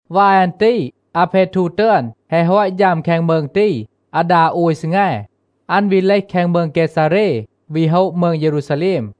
วาย อัน ตี อาเพทู ตึอน แฮะ ฮอต ฌัม แคง มืง ตี อาดา โอย ซีแง, อัน วี เลห แคง มืง เกซาเร วี โฮะ มืง เยรูซาแลม.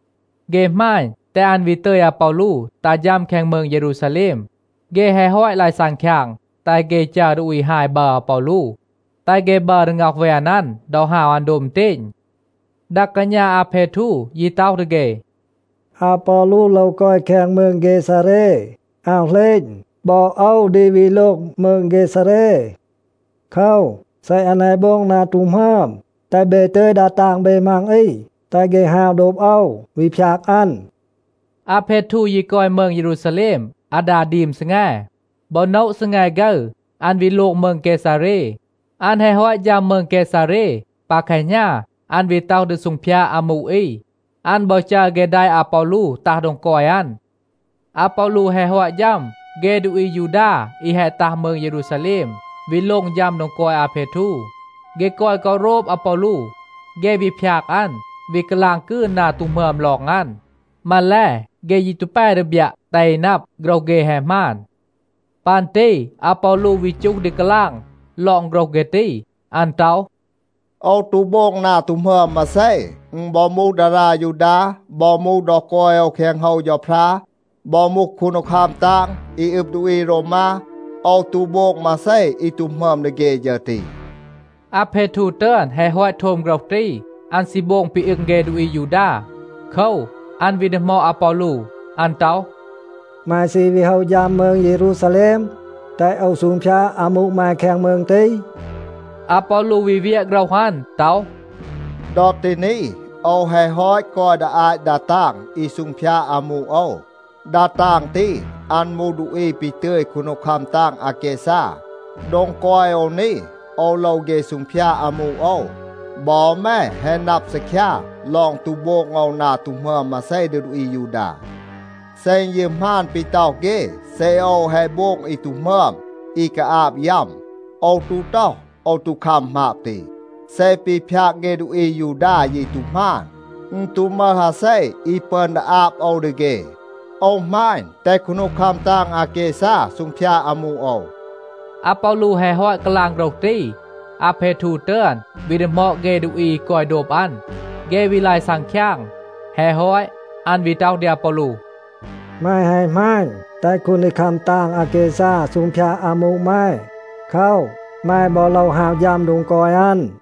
เฆ หมาณ, แตห อัน วี ตึย อาปอลู ตัห ฌัม แคง มืง เยรูซาแลม. เฆ แฮะ ฮอต ลาย ซังคยาง, แตห เฆ จัร ดูอี ฮาย บัร อาปอลู, แตห เฆ บัร ดี ง็อห แวน อัน ดอ ฮาว อัน โดบ อึณเตณ. ดา กาณา อาเพทู ยี ต็อห ดี เฆ, “อาปอลู โลว กอย แคง มืง เกซาเร. อาว เหลณ, บอ โอว ดี วี โลง มืง เกซาเร. โคว, เซ อัน แฮะ โบง นา ตู หมึอม, แตห เบ ตึย ดา ตาง เบ มัง อี, แตห เฆ ฮาว โดบ โอว, วี พยาก อัน.” อาเพทู ยี กอย มืง เยรูซาแลม อาดา ดีม ซีแง. บอ โนะ ซีแง ฆึร, อัน วี โลง มืง เกซาเร. อัน แฮะ ฮอต ฌัม มืง เกซาเร, ปา แคหณา, อัน วี ต็อห ดี ซูงพยาด อามู อี. อัน บอ จัร เฆ แดะ อาปอลู ตัห โดง กอย อัน. อาปอลู แฮะ ฮอต ฌัม, เฆ ดูอี อายูดา, อี แฮะ ตัห มืง เยรูซาแลม, วี โลง ฌัม โดง กอย อาเพทู, เฆ กอย กอ โรบ อาปอลู. เฆ วี พยาก อัน, วี กาลาง กืน นา ตู หมึอม ลอง อัน. มาแล, เฆ ยี ตู แป ดี บยัะ, แตห อี นับ, โฆรห เฆ แฮะ หมาน. ปัน ตี อาปอลู วี จูห ดี กาลาง ลอง โฆรห เฆ ตี, อัน ต็อห, “โอว ตู โบง นา ตู หมึอม มาเซ. อึณ บอ มูห ดารา ยูดา, บอ มูห ดอ กอย โอว แคง โฮว เฌาพรา, บอ มูห คูนดีคัม ตาง อี อึบ ดูอี โรวมา, โอว ตู โบง มาเซ อี ตู หมึอม ดี เฆ ฌึร ตี.” อาเพทู ตึอน แฮะ ฮอต โทม โฆรห ตี, อัน ซี โบง ปี อึง เฆ ดูอี อายูดา. โคว, อัน วี ดีหมอด อาปอลู. อัน ต็อห, “แม ซี วี โฮะ ฌัม มืง เยรูซาแลม, แตห โอว ซูงพยาด อามู แม แคง มืง ตี?” อาปอลู วี เวียะ โฆรห อัน ต็อห, “ดอ ตี นี, โอว แฮะ ฮอต กอย ดี อาต ดา ตาง อี ซูงพยาด อามู โอว. ดา ตาง ตี, อัน มูห ดูอี ปี ตึย คูนดีคัม ตาง อาแกซา. โดง กอย โอว นี, โอว โลว เฆ ซูงพยาด อามู โอว. บอ แม แฮะ นับ ซีคยา ลอง ตู โบง โอว นา ตู หมึอม มาเซ ดี ดูอี อายูดา. เซ อึณ ยี หมาน ปี ต็อห เฆ, เซ โอว แฮะ โบง อี ตู หมึอม อี กาอาบ ยัม, โอว ตู ต็อห, โอว ตู คัม หมาบ ตี. เซ ปี พยาก เฆ ดูอี อายูดา ยี ตู หมาน, อึณ ตู มึห อาเซ อี ปึอน ดี อาบ โอว ดี เฆ. โอว หมาณ, แตห คูนดีคัม ตาง อาแกซา ซูงพยาด อามู โอว.” อาปอลู แฮะ ฮอต กาลาง โฆรห ตี, อาเพทู ตึอน วี ดีหมอด เฆ ดูอี อี กอย โดบ อัน. เฆ วี ลาย ซังคยาง. แฮะ ฮอต, อัน วี ต็อห ดี อาปอลู, “แม แฮะ หมาณ, แตห คูนดีคัม ตาง อาแกซา ซูงพยาด อามู แม. โคว, แม บอ โลว ฮาว ฌัม โดง กอย อัน.”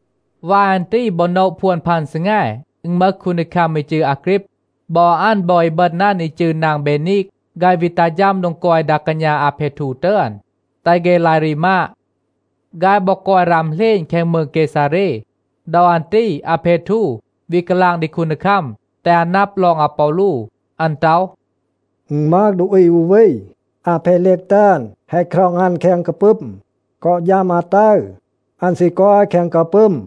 วาย อัน ตี บอ โนะ พวน พัน ซีแง, อึณ มึห คูนดีคัม อี จืร อาฆรีบ. บอ อัน, บอ อีบึณ อัน อี จืร นาง เบนีก, ฆาย วี ตัห ฌัม โดง กอย ดา กาณา อาเพทู ตึอน, แตห เฆ ลาย รีมาด. ฆาย บอ กอย ราม เหลณ แคง มืง เกซาเร. ดอ อัน ตี อาเพทู วี กาลาง ดี คูนดีคัม, แตห อัน นับ ลอง อาปอลู. อัน ต็อห, “อึณ มึห ดูอี อู วี, อาเพลีก ตึอน แฮะ คร็อง อัน แคง กาปึม. กอ ฌัม อาตึร, อัน ซี กอย แคง กาปึม.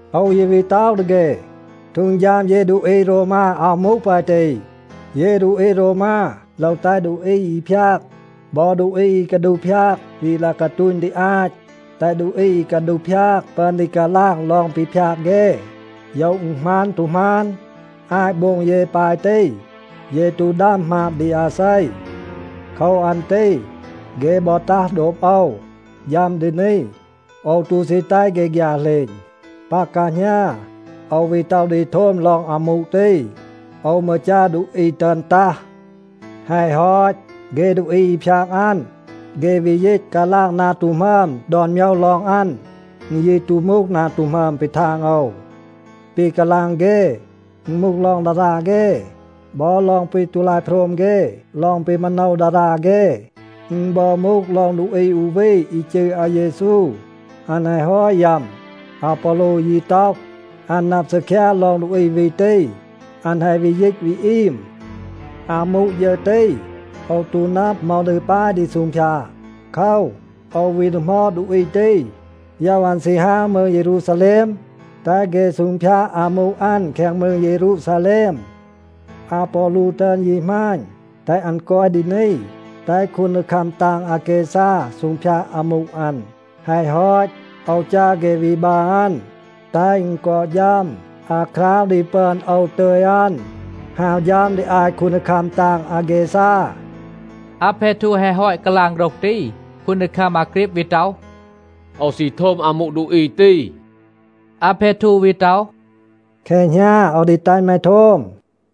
โอว ยี วี ต็อห ดี เฆ, ฮีด เย ดูอี โรวมา อาว มูห ปาย ตี. เย ดูอี โรวมา โลว แตห ดูอี อี พยาก บอ ดูอี อี กาดูห พยาก วี ลาย กาตูณ ดี อาต, แตห ดูอี อี กาดูห พยาก ปึอน ดี กาลาง ลอง ปี พยาก เฆ, โยว อึณ หมาน ตู หมาน. อาต โบง เย ปาย ตี, เย ตู ดัม หมาบ ดี อาเซ. โคว อัน ตี เฆ บอ ตัห โดบ โอว, ฌัม ดี นี. โอว ตู ซี แตห เฆ ฆยา เหลณ. ปา แคหณา โอว วี ต็อห ดี โทม ลอง อามู ตี. โอว มืร จัร ดูอี ตึอน ตัห. แฮะ ฮอต, เฆ ดูอี อี พยาก อัน, เฆ วี ยีต กาลาง นา ตู หมึอม ดอน โมยว ลอง อัน. อึณ ยี ตู มูห นา ตู หมึอม ปี ทาง โอว. ปี กาลาง เฆ, อึณ มูห ลอง ดารา เฆ, บอ ลอง ปี ตู ลาย โพรม เฆ ลอง ปี มาโนว ดารา เฆ. อึณ บอ มูห ลอง ดูอี อู วี อี จืร อาเยซู, อัน แฮะ ฮอต ยัม. อาปอลู ยี ต็อห, อัน นับ ซีคยา ลอง ดูอี วี ตี, อัน แฮะ วี ยีต วี อีม. อามู ฌึร ตี, โอว ตู นับ เหมา ดี ปาย ดี ซูงพยาด. โคว, โอว วี ดีหมอด ดูอี ตี, โยว อัน ซี ฮาว มืง เยรูซาแลม, แตห เฆ ซูงพยาด อามู อัน แคง มืง เยรูซาแลม. อาปอลู ตึอน ยี หมาณ, แตห อัน กอย ดี นี, แตห คูนดีคัม ตาง อาแกซา ซูงพยาด อามู อัน. แฮะ ฮอต, โอว จัร เฆ วี บัร อัน, แตห อึณ กอ ฌัม อาคราว ดี ปึอน โอว ตึย อัน ฮาว ฌัม ดี อาต คูนดีคัม ตาง อาแกซา.” อาเพทู แฮะ ฮอต กาลาง โฆรห ตี, คูนดีคัม อาฆรีบ วี ต็อห, “โอว ซี โทม อามู ดูอี ตี.” อาเพทู วี ต็อห, “แคหณา โอว ดี แตห แม โทม.”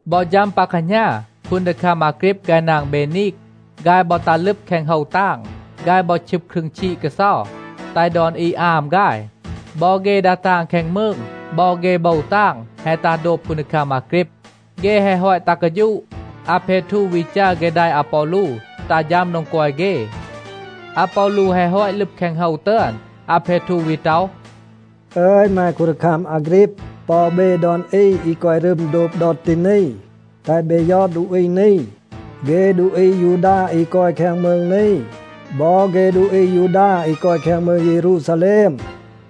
บอ ฌัม ปา แคหณา, คูนดีคัม อาฆรีบ ฆาย นาง เบนีก, ฆาย บอ ตัห ลึบ แคง โฮว ตาง. ฆาย บอ ชึบ ครึง ชีด กาเซา, แตห ดอน อี อาม ฆาย. บอ เฆ ดา ตาง แคง มืง, บอ เฆ โบว ตาง แฮะ ตัห โดบ คูนดีคัม อาฆรีบ. เฆ แฮะ ฮอต ตัห กาฌูะ, อาเพทู วี จัร เฆ แดะ อาปอลู ตัห ฌัม โดง กอย เฆ. อาปอลู แฮะ ฮอต ลึบ แคง โฮว ตึอน, อาเพทู วี ต็อห, “อึย แม คูนดีคัม อาฆรีบ บอ เบ ดอน อี อี กอย รึม โดบ โอว ดอ ตี นี, แตห เบ ยอด ดูอี นี. เฆ ดูอี อายูดา อี กอย แคง มืง นี, บอ เฆ ดูอี อายูดา อี กอย แคง มืง เยรูซาแลม,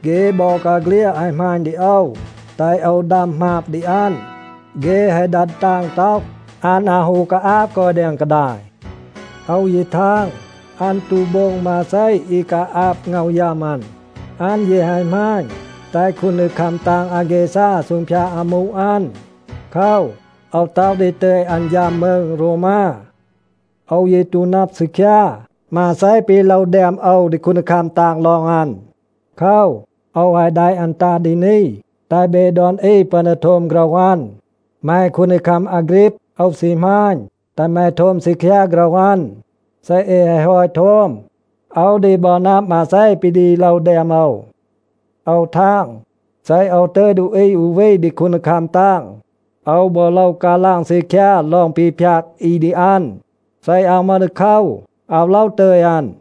เฆ บอกาเฆลียด แฮะ หมาณ ดี โอว, แตห โอว ดัม หมาบ ดี อัน. เฆ แฮะ ดัด ตาง ต็อห, อัน อาว ฮู กาอาบ กอย แดง กาดาย. โอว ยี ทาง, อัน ตู โบง มาเซ อี กาอาบ ง็อห ยัม อัน. อัน ยี แฮะ หมาณ, แตห คูนดีคัม ตาง อาแกซา ซูงพยาด อามู อัน. โคว, โอว ต็อห ดี ตึย อัน ฌัม มืง โรวมา. โอว ยี ตู นับ ซีคยา, มาเซ ปี โลว แดม โอว ดี คูนดีคัม ตาง ลอง อัน. โคว, โอว แฮะ แดะ อัน ตัห ดี นี, แตห เบ ดอน อี ปึอน ดี โทม โฆรห อัน. แม คูนดีคัม อาฆรีบ, โอว ซี หมาณ, แตห แม โทม ซีคยา โฆรห อัน. เซ เอ แฮะ ฮอต โทม, โอว ดี บอ นับ มาเซ ปี ดี โลว แดม โอว. โอว ทาง, เซ โอว ตึย ดูอี อู วี ดี คูนดีคัม ตาง, โอว บอ โลว กาลาง ซีคยา ลอง ปี พยาก อี ดี อัน. เซ อาว มึห ดีโคว, อาว โลว ตึย อัน.”